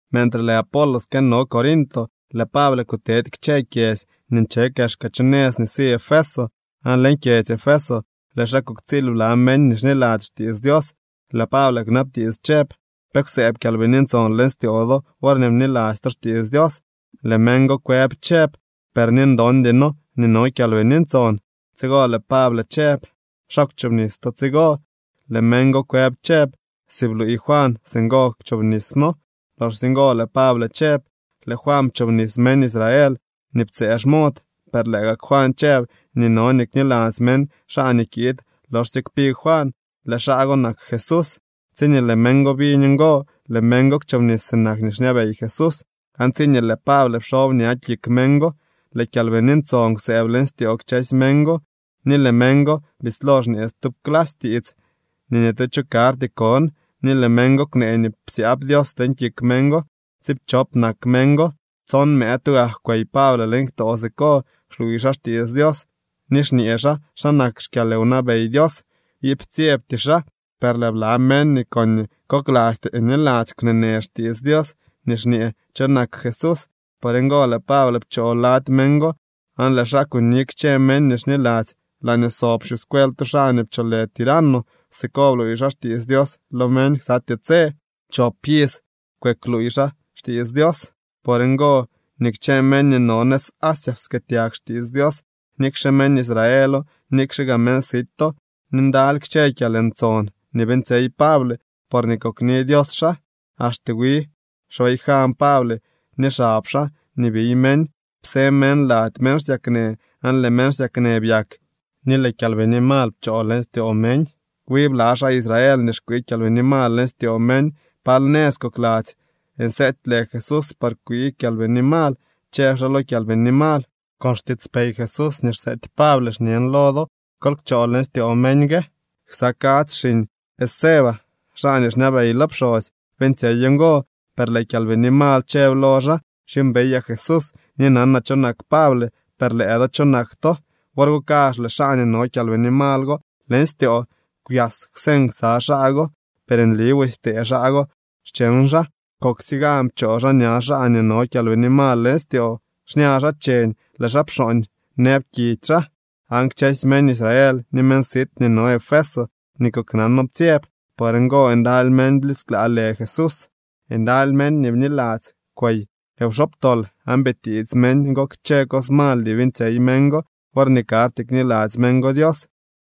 Mentre lëë Apolos këno Corinto, lëë Pable kutedy kchë kyedzy nii nche kexka chu nëz nii si Efeso, aan leñ kyedzy Efeso lëë xaa kuktsiil bla meñ nii xniladzy xtiits Dios. Lëë Pable kwnabtiits chëb: —¿Pe kwsëëb Kyalbini Ntson leñ styoo do worñee bniladzy to xtiits Dios? Lëë meñ go kwëb chëb: —Per ni ndondy noo nii no Kyalbini Ntson. Tsigo lëë Pable chëb: —¿Xa kwchobnis to tsigo? Lëë meñ go kwëb chëb: —Si bluuy Juan, singo kwchobnis noo. Loxsye ngo lëë Pable chëb: —Lëë Juan pchoobnis meñ Israel nii ptsëë xmod, per lëë gak Juan chëb nii no nii kniladzy meñ xaa nii kiid loxsye kpi Juan. Lëë xaa go nak Jesús. Tsiñee lëë meñ go biñ ngo, lëë meñ go kwchobnis sinak nii xñabey Jesús. Aan tsiñee lëë Pable pxob ña kik meñ go, lëë Kyalbini Ntson kwsëëb leñ styoo kchësy meñ go, ni lëë meñ go bislo xñee stub clasy tiits ni nii tu cho karty kon ni lëë meñ go kwnee nii psyaab Dios leñ kik meñ go. Tsiipchop nak meñ go. Tson mëë tugak kwey Pable leñ ktoo siko, xluuy xaa xtiits Dios ni xñee xaa xa nak xkyalwnabey Dios. Iip ptsyebty xaa. Per lëë bla meñ nii koñee koklasty niladzy kwneenë xtiits Dios nii xñee cho nak Jesús. Por ngo lëë Pable pchoo lady meñ go aan lëë xaa kuni kchë meñ nii xniladzy laañee sob xyuscuel tu xaa nii pcholë Tirano. Siko bluuy xaa xtiits Dios lo meñ ksatyee tse. Chop iz kwëkluuy xaa xtiits Dios. Por ngo nii kchë meñ nii no nëz Asia pkëëtyag xtiits Dios, nikxe meñ Israelo, nikxe gaa meñ sito. Ni ndaly kchë kyalntson nii beeñtsyey Pable porñee kokni Dios xaa. Axte wi xbayjan Pable ni xab xaa nii biy meñ psë meñ lady meñ xsyaknë aan lëë meñ xsyaknë byak ni lëë kyalbini mal pchoo leñ styoo meñ. Wi bla xaa Israel nii xkwii kyalbini mal leñ styoo meñ pal nëz kokladzy nseety lë Jesús par kwii kyalbini mal, chëb xaa lo kyalbini mal: —Con xtiitspey Jesús nii xseety Pable xñen lo do: Kol kchoo leñ styoo meñ gue. Ksa kadzy xiñ Esceva, xaa nii xñabey lo pxosy, beeñtsyey ngo. Per lëë kyalbini mal chëb lo xaa: —Xyuumbeyaa Jesús, ni nanaa cho nak Pable. Per lëë do, ¿cho nak to? Wor go kazh lëë xaa nii no kyalbini mal go leñ styoo kwyas kwseñ ksa xaa go. Per nli busy ptee xaa go xcheñ xaa. Koksye gan pchoo xaa ña xaa nii no kyalbini mal leñ styoo. Xña xaa cheñ lëë xaa pxooñ nëb kidy xaa. Aan kchësy meñ Israel ni meñ sit nii no Efeso nii koknano ptsyeb. Por ngo ndaly meñ blisklaa lë Jesús. Ndaly meñ nii bniladzy kwey wxobtol, aan bitiits meñ go kchë cos mal nii beeñtsyey meñ go worñee karty kniladzy meñ go Dios.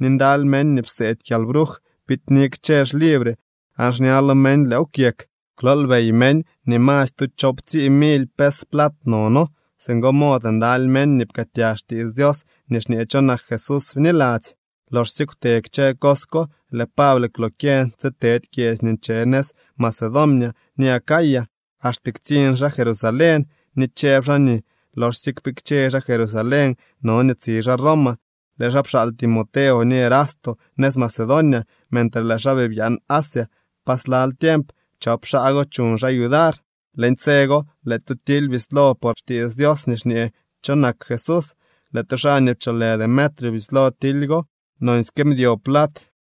Ni ndaly meñ nii pseedy kyalbruj biidni kchë xlibre, aan xña lo meñ lëëw kwyek. Kwloolbey meñ nii masy tu choowptsii mily pes plat nono. Singo mod ndaly meñ nii pkëëtyag xtiits Dios nii xñee cho nak Jesús bniladzy. Loxsye kwte kchë cos ko, lëë Pable kwlokyeñ tsitedy kyedzy nii nche nëz Macedonia ni Acaya, axte ktsiñ xaa Jerusalén. Ni chëb xaa nii loxsye kpikche xaa Jerusalén, no nii tsi xaa Roma. Lëë xaa pxaal Timoteo ni Erasto nëz Macedonia mentre lëë xaa bii byaan Asia pa slal tiemp. Chop xaa go chuñ xaa yudar. Leñ tse go lëë tu tily bislo por xtiits Dios nii xñee cho nak Jesús. Lëë tu xaa nii pcholë Demetrio bislo tily go. Nonsyke mdyo plat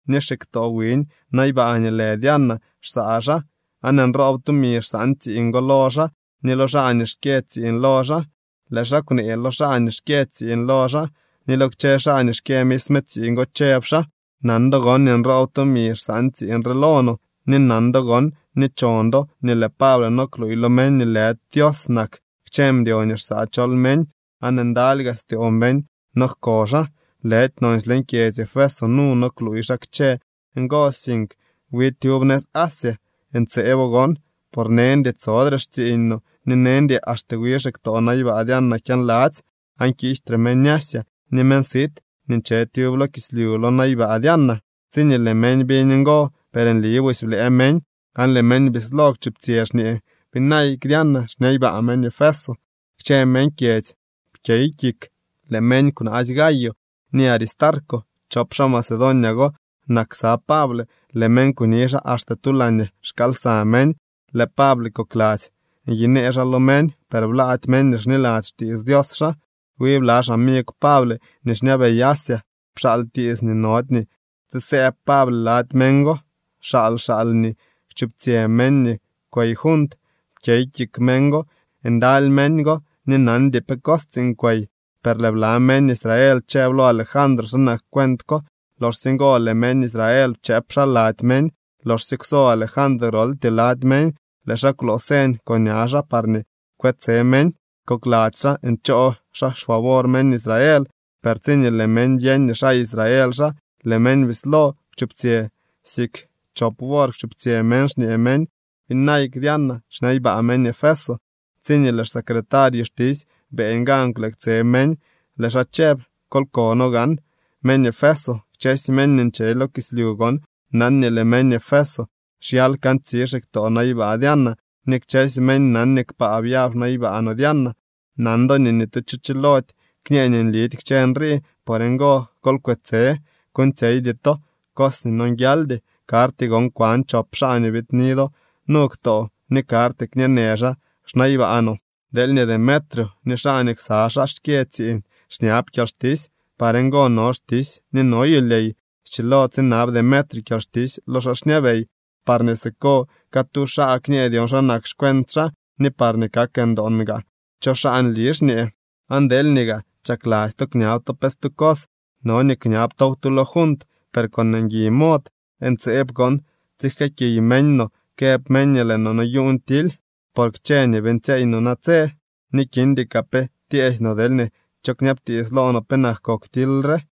ni xiktoo wiñ naybaa nii lë Diana xsaa xaa, aan nroob tumi xsaan tsiiñ go lo xaa ni lo xaa nii xkyë tsiiñ lo xaa. Lëë xaa kwnee lo xaa nii xkyë tsiiñ lo xaa, ni lo kchë xaa nii xkyë misme tsiiñ go, chëb xaa: —Nan do gon nii nroob tumi xsaan tsiiñ re lo no. Ni nan do gon ni chon do nii lëë Pable no kluuy lo meñ nii lëdy Dios nak kchë mdyo nii xsaa chol meñ, aan ndaly gaa styoo meñ nojko xaa. Lëdy nonsy leñ kyedzy Efeso nu no kluuy xaa kchë ngo, sink wi tyub nëz Asia. Ntseebo gon, por neñdy tsodre xtsiiñ no, ni neñdy axte wi xiktoo naybaa Diana kyaanladzy aan kiijtre meñ Asia ni meñ sit nii nche tyub lo kislyu lo naybaa Diana. Tsiñee lëë meñ biñ ngo, per nli busy blëë meñ aan lëë meñ bislo kwchuptsyë, xñee: —¡Byinayk Diana xnaybaa meñ Efeso! Kchë meñ kyedzy pkyey kik. Lëë meñ kwnaasy Gayo ni Aristarco. Chop xaa Macedonia go nak ksa Pable. Lëë meñ kuni xaa axte tu laañee xkaal lsa meñ. Lëë Pable kokladzy nyinee xaa lo meñ, per blaady meñ nii xniladzy xtiits Dios xaa. Wi bla xamigw Pable nii xñabey Asia pxaal tiits nii nody nii tsisëëb Pable lady meñ go. Xaal xaal nii kwchuptsyë meñ nii kwey junt. Pkyey kik meñ go. Ndaly meñ go ni nandy dyon pe cos tsiiñ kwey. Per lëë bla meñ Israel chëb lo Alejandro xa nak cuent ko. Loxsye ngo lëë meñ Israel pchëëp xaa lady meñ. Loxsye kwso Alejandro groltyee lady meñ, lëë xaa kwloo señ con ña xaa parñee kwetse meñ. Kokladzy xaa nchoo xaa xfavor meñ Israel. Per tsiñee lëë meñ byeñ nii xaa Israel xaa, lëë meñ bislo kwchuptsyë. Siik chop wor kwchuptsyë meñ, xñee meñ: —¡Byinayk Diana, xnaybaa meñ Efeso! Tsiñee lëë xsecretario xtisy beeñ gan kwleektse meñ, lëë xaa chëb: —Kol kono gaa meñ Efeso, kchësy meñ nii nche lo kislyu gon nan nii lëë meñ Efeso xyal kantsi xiktoo naybaa Diana ni kchësy meñ nan nii kpaa byab xnaybaa no Diana. Nan do nii ni tu cho chilody kñë nii nlidy kchë nrii. Por ngo, kol kwetse. Kuuñtsyeydy to cos nii nonguialdy. Karty gon kwan chop xaa nii biidni do nu ktoo ni karty kñeenë xaa xnaybaa no. Deelñee Demetrio ni xaa nii ksa xaa xkyë tsiiñ xñab kyalxtisy, par ngo no xtisy ni no yulyey. Schilo tsinab Demetrio kyalxtisy lo xaa xñabey parñee siko catu xaa kñee dyon xa nak xcuent xaa ni parñee kak ndoon gaa cho xaa nli xñee. Aan deelñee gaa chakladzy to kñab to pe stu cos, no nii kñab tow tu lo junt, per con ngui mod. Ntseeb gon tsijkëëkiy meñ no këb meñ nii lëë no noyuuñ tily por kchë nii beeñtsyeey no natse, ni kindy kaa pe tyeesy no deelñee cho kñabtiits lo no penak kok tily re.